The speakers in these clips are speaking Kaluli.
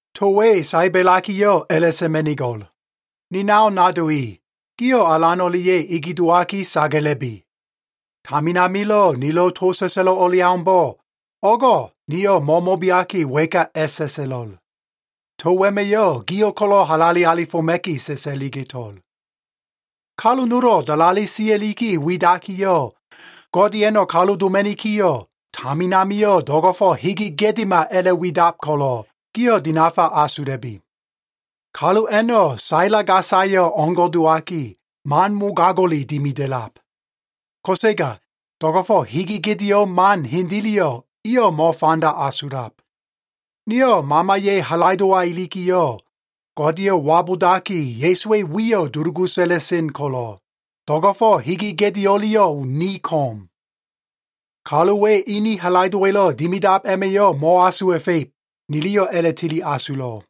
To we saebelakiyo꞉ a꞉la꞉ sa꞉ma꞉nigo꞉l. Ni nao nado i, gio꞉ Alan o꞉lia꞉ ege dowaki sagala꞉bi. Tamin amilo꞉ nilo꞉ to sa꞉sa꞉lo꞉ o꞉leaumbo꞉, o꞉go꞉ niyo꞉ mo꞉mo꞉beaki wa꞉ka a꞉sa꞉sa꞉lo꞉l. To wema꞉yo꞉ gio꞉ ko꞉lo꞉ halale alifoma꞉ki sa꞉sa꞉liga꞉to꞉l. Kalu nolo꞉ dalale sia꞉liki widakiyo꞉, Godeya꞉no꞉ kalu doma꞉nikiyo꞉, tamin amio꞉ do꞉go꞉fo꞉ hege gedema a꞉la꞉widab ko꞉lo꞉, gio꞉ dinafa asula꞉bi. Kalu a꞉no꞉ saila gasayo꞉ o꞉ngo꞉ dowaki, man mogago꞉le dimida꞉lab. Ko꞉sega do꞉go꞉fo꞉ hege gedeo꞉ man hendeleyo꞉ iyo꞉ mo꞉fanda asulab. Nio꞉ Mamaya꞉ halaido꞉wa ilikiyo꞉, Godeyo꞉ wabudaki Ya꞉suwa꞉ wiyo꞉ dulugu sa꞉la꞉sen ko꞉lo꞉, do꞉go꞉fo꞉ hege gedeo꞉leyo꞉ ni ko꞉m. Kaluwa꞉ ene halaido꞉wa꞉lo꞉ dimidab a꞉ma꞉yo꞉ mo꞉asuwa꞉fa꞉ib, niliyo꞉ a꞉la꞉tili asulo꞉.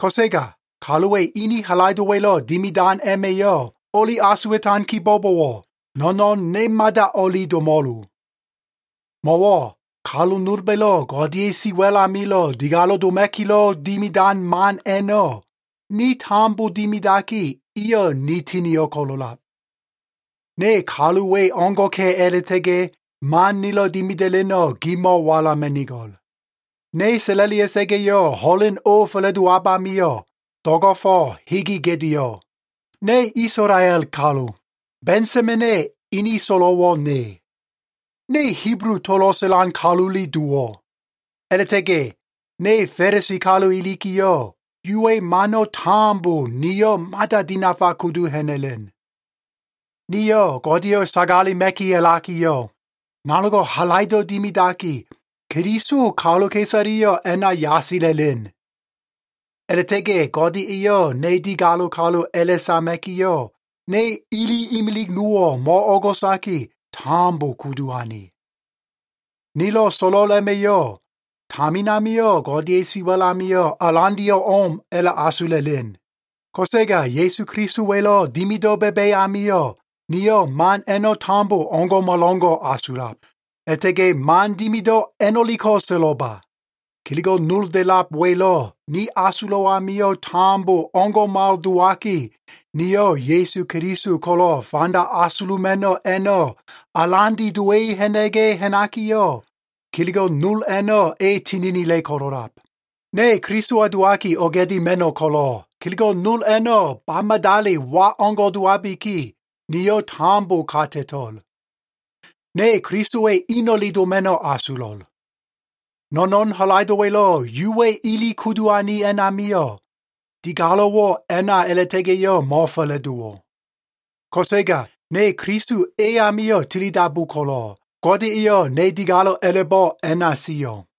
Ko꞉sega kaluwa꞉ ene halaido꞉wa꞉lo꞉ dimidan a꞉ma꞉yo꞉ o꞉li asuwa꞉tan kibo꞉bowo꞉, no꞉no꞉n ne mada o꞉li domo꞉lo. Mo꞉wo꞉ kalu nolba꞉lo꞉ Godeya꞉ siwa꞉l amilo꞉ digalo꞉ doma꞉kilo꞉ dimidan man a꞉no꞉, ni tambo dimidaki, iyo꞉ ni tinio꞉ ko꞉lo꞉lab. Ne kalu we o꞉ngo꞉ka꞉ a꞉la꞉likiyo꞉ man nilo꞉ dimida꞉leno꞉ gimo꞉ walama꞉nigo꞉l. Ne sa꞉la꞉lia꞉sa꞉ga꞉yo꞉, ho꞉len o fa꞉la꞉dowab amio꞉, do꞉go꞉fo꞉ hege gedeo꞉. Ne Isolael kalu. Ba꞉nsamena꞉ ene so꞉lo꞉wo꞉ ne. Ne Hibulu tolo꞉ sa꞉lan kalule dowo꞉. A꞉la꞉ta꞉ga꞉ ne Fa꞉lisi kalu ilikiyo꞉, Yuwa꞉ mano꞉ tambo niyo꞉ mada dinafa kudu ha꞉na꞉len. Niyo꞉ Godeyo꞉ sagalema꞉ki a꞉lakiyo꞉, nanogo꞉ halaido꞉ dimidaki, Keliso kaluka꞉isaleyo꞉ a꞉na yasala꞉len. A꞉la꞉ta꞉ga꞉ Gode eyo꞉ ne digalo꞉ kalu a꞉la꞉sama꞉kiyo꞉, ne ele imilig nowo꞉ mo꞉o꞉go꞉saki, tambo kudu ane. Nilo꞉ so꞉lo꞉l a꞉ma꞉yo꞉, tamin amio꞉ Godeya꞉ siwa꞉l amio꞉ alandeyo꞉ o꞉m a꞉la꞉asula꞉len. Ko꞉sega Ya꞉su Kelisowa꞉lo꞉ dimido꞉ ba꞉ba꞉ amio꞉, niyo꞉ man a꞉no꞉ tambo o꞉ngo꞉malo꞉ngo꞉ asulab. A꞉la꞉ta꞉ga꞉ man dimido꞉ a꞉no꞉leko꞉ so꞉lo꞉ba. Kelego꞉ nol da꞉lab welo꞉ ni asulo꞉ amio꞉ tambo o꞉ngo꞉mal dowaki, niyo꞉ Ya꞉su Keliso ko꞉lo꞉ fanda asuluma꞉no꞉ a꞉no꞉ alande dowa꞉i ha꞉na꞉ga꞉ ha꞉nakiyo꞉, kelego꞉ nol a꞉no꞉ e tininila꞉ ko꞉lo꞉lab. Ne Kelisowa dowaki oga꞉dima꞉no꞉ ko꞉lo꞉, kelego꞉ nol a꞉no꞉ ba madali wa o꞉ngo꞉ dowabiki, niyo꞉ tambo ka ta꞉to꞉l. Ne Kelisowa꞉ eno꞉le doma꞉no꞉ asulo꞉l. No꞉no꞉n halaido꞉wa꞉lo꞉ Yuwa꞉ ele kudu ane a꞉namio꞉, digalo꞉wo꞉ a꞉na a꞉la꞉ta꞉ga꞉yo꞉ mo꞉fa꞉la꞉dowo꞉. Ko꞉sega ne Keliso e amio꞉ tilidabu ko꞉lo꞉, Gode eyo꞉ ne digalo꞉ a꞉la꞉bo꞉ a꞉na sio꞉.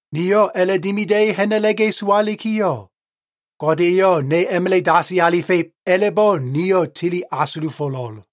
Niyo꞉ a꞉la꞉dimida꞉i ha꞉na꞉la꞉ga꞉ sowalikiyo꞉, Gode eyo꞉ ne a꞉ma꞉la꞉ dasi alifa꞉ib a꞉la꞉bo꞉ niyo꞉ tili asulufo꞉lo꞉l.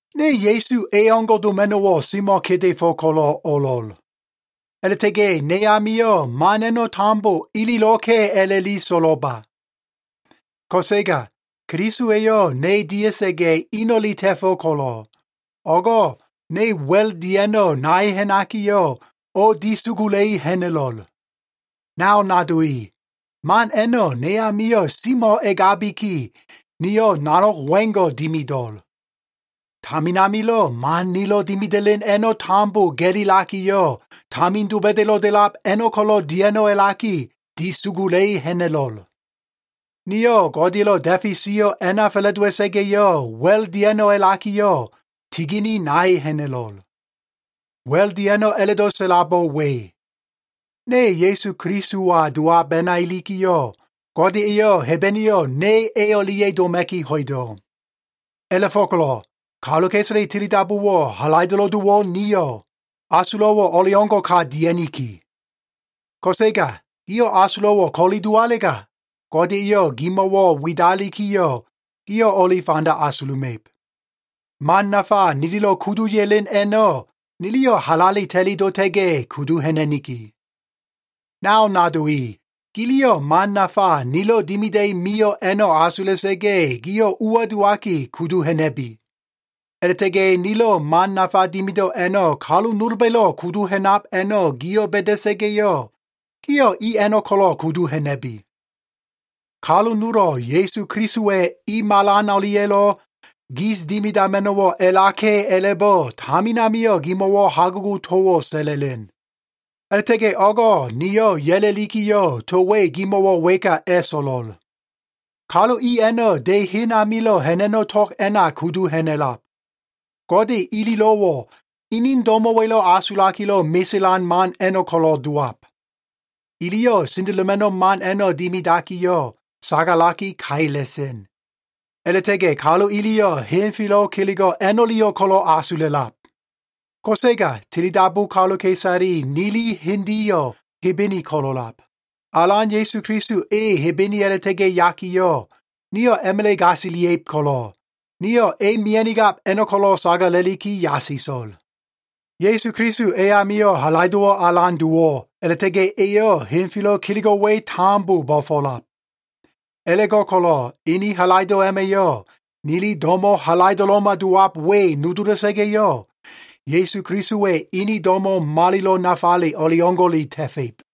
Ne Ya꞉su e o꞉ngo꞉ doma꞉no꞉wo꞉ semo꞉ kedefo꞉ ko꞉lo꞉ o꞉lo꞉l. A꞉la꞉ta꞉ga꞉ ne amio꞉ man a꞉no꞉ tambo ililo꞉ka꞉ a꞉la꞉li so꞉lo꞉lba. Ko꞉sega Keliso eyo꞉ ne dia꞉sa꞉ga꞉, eno꞉le ta꞉fo꞉ ko꞉lo꞉, o꞉go꞉ ne wa꞉l dia꞉no꞉ nai ha꞉nakiyo꞉, o꞉disugula꞉i ha꞉na꞉lo꞉l. Nao nado i, man a꞉no꞉ ne amio꞉ semo꞉ egabiki, niyo꞉ nanog wengo꞉ dimido꞉l. Tamin amilo꞉ man nilo꞉ dimida꞉len a꞉no꞉ tambo ga꞉lilakiyo꞉, tamin doba꞉da꞉lo꞉ da꞉lab a꞉no꞉ ko꞉lo꞉ dia꞉no꞉ a꞉laki, disugula꞉i ha꞉na꞉lo꞉l. Niyo꞉ Godeya꞉lo꞉ da꞉fe sio꞉ a꞉na fa꞉la꞉dowa꞉sa꞉ga꞉yo꞉, wa꞉l dia꞉no꞉ a꞉lakiyo꞉, tigini nai ha꞉na꞉lo꞉l. Wa꞉l dia꞉no꞉ a꞉la꞉do꞉ sa꞉labo꞉ we. Ne Ya꞉su Kelisowa dowab a꞉na ilikiyo꞉, Gode eyo꞉ Hebeneyo꞉ ne e o꞉lia꞉ doma꞉ki ho꞉ido꞉. A꞉la꞉fo꞉ko꞉lo꞉ kaluka꞉isale tilidabuwo꞉ halaido꞉lo꞉ dowo꞉ nio꞉, asulo꞉wo꞉ o꞉leo꞉ngo꞉ka dia꞉niki. Ko꞉sega gio꞉ asulo꞉wo꞉ ko꞉li dowalega, Gode eyo꞉ gimo꞉wo꞉ widalikiyo꞉, gio꞉ o꞉li fanda asuluma꞉ib. Man nafa nililo꞉ kudu ya꞉len a꞉no꞉, niliyo꞉ halale ta꞉li dota꞉ga꞉ kudu ha꞉na꞉niki. Nao nado i, giliyo꞉ man nafa nilo꞉ dimida꞉i mio꞉ a꞉no꞉ asula꞉sa꞉ga꞉, gio꞉ ua dowaki, kudu ha꞉na꞉bi. A꞉la꞉ta꞉ga꞉ nilo꞉ man nafa dimido꞉ a꞉no꞉ kalu nolba꞉lo꞉ kudu ha꞉nab a꞉no꞉ gio꞉ ba꞉da꞉sa꞉ga꞉yo꞉, gio꞉ i a꞉no꞉ ko꞉lo꞉ kudu ha꞉na꞉bi. Kalu nolo꞉ Ya꞉su Kelisowa꞉ i malan o꞉lia꞉lo꞉ gis dimidama꞉no꞉wo꞉ a꞉laka꞉ a꞉la꞉bo꞉ tamin amio꞉ gimo꞉wo꞉ hagugo꞉ towo꞉ sa꞉la꞉len. A꞉la꞉ta꞉ga꞉ o꞉go꞉ niyo꞉ ya꞉la꞉likiyo꞉ to we gimo꞉wo꞉ wa꞉ka a꞉so꞉lo꞉l. Kalu i a꞉no꞉ de hen amilo꞉ ha꞉na꞉no꞉ tog a꞉na kudu ha꞉na꞉lab. Gode ililo꞉wo꞉ ini do꞉mo꞉wa꞉lo꞉ asulakilo꞉ meselan man a꞉no꞉ ko꞉lo꞉ dowab. Iliyo꞉ sendeloma꞉no꞉ man a꞉no꞉ dimidakiyo꞉, sagalaki kaila꞉sen. A꞉la꞉ta꞉ga꞉ kalu iliyo꞉ henfelo꞉ kelego꞉ a꞉no꞉leyo꞉ ko꞉lo꞉ asula꞉lab. Ko꞉sega tilidabu kaluka꞉isale nili hendeyo꞉ Hebene ko꞉lo꞉lab. Alan Ya꞉su Keliso e Hebene a꞉la꞉ta꞉ga꞉ yakiyo꞉, nio꞉ a꞉ma꞉la꞉ gasilia꞉ib ko꞉lo꞉, nio꞉ e mia꞉nigab a꞉no꞉ ko꞉lo꞉ sagala꞉liki yasiso꞉l. Ya꞉su Keliso e amio꞉ halaido꞉wo꞉ alan dowo꞉, a꞉la꞉ta꞉ga꞉ eyo꞉ henfelo꞉ kelego꞉ we tambo bo꞉fo꞉lab. A꞉la꞉go꞉ko꞉lo꞉ ene halaido꞉ a꞉ma꞉yo꞉ nili do꞉mo꞉ halaido꞉lo꞉ma dowab we nodola꞉sa꞉ga꞉yo꞉, Ya꞉su Kelisowa꞉ ene do꞉mo꞉ malilo꞉ nafale o꞉leo꞉ngo꞉le ta꞉fa꞉ib.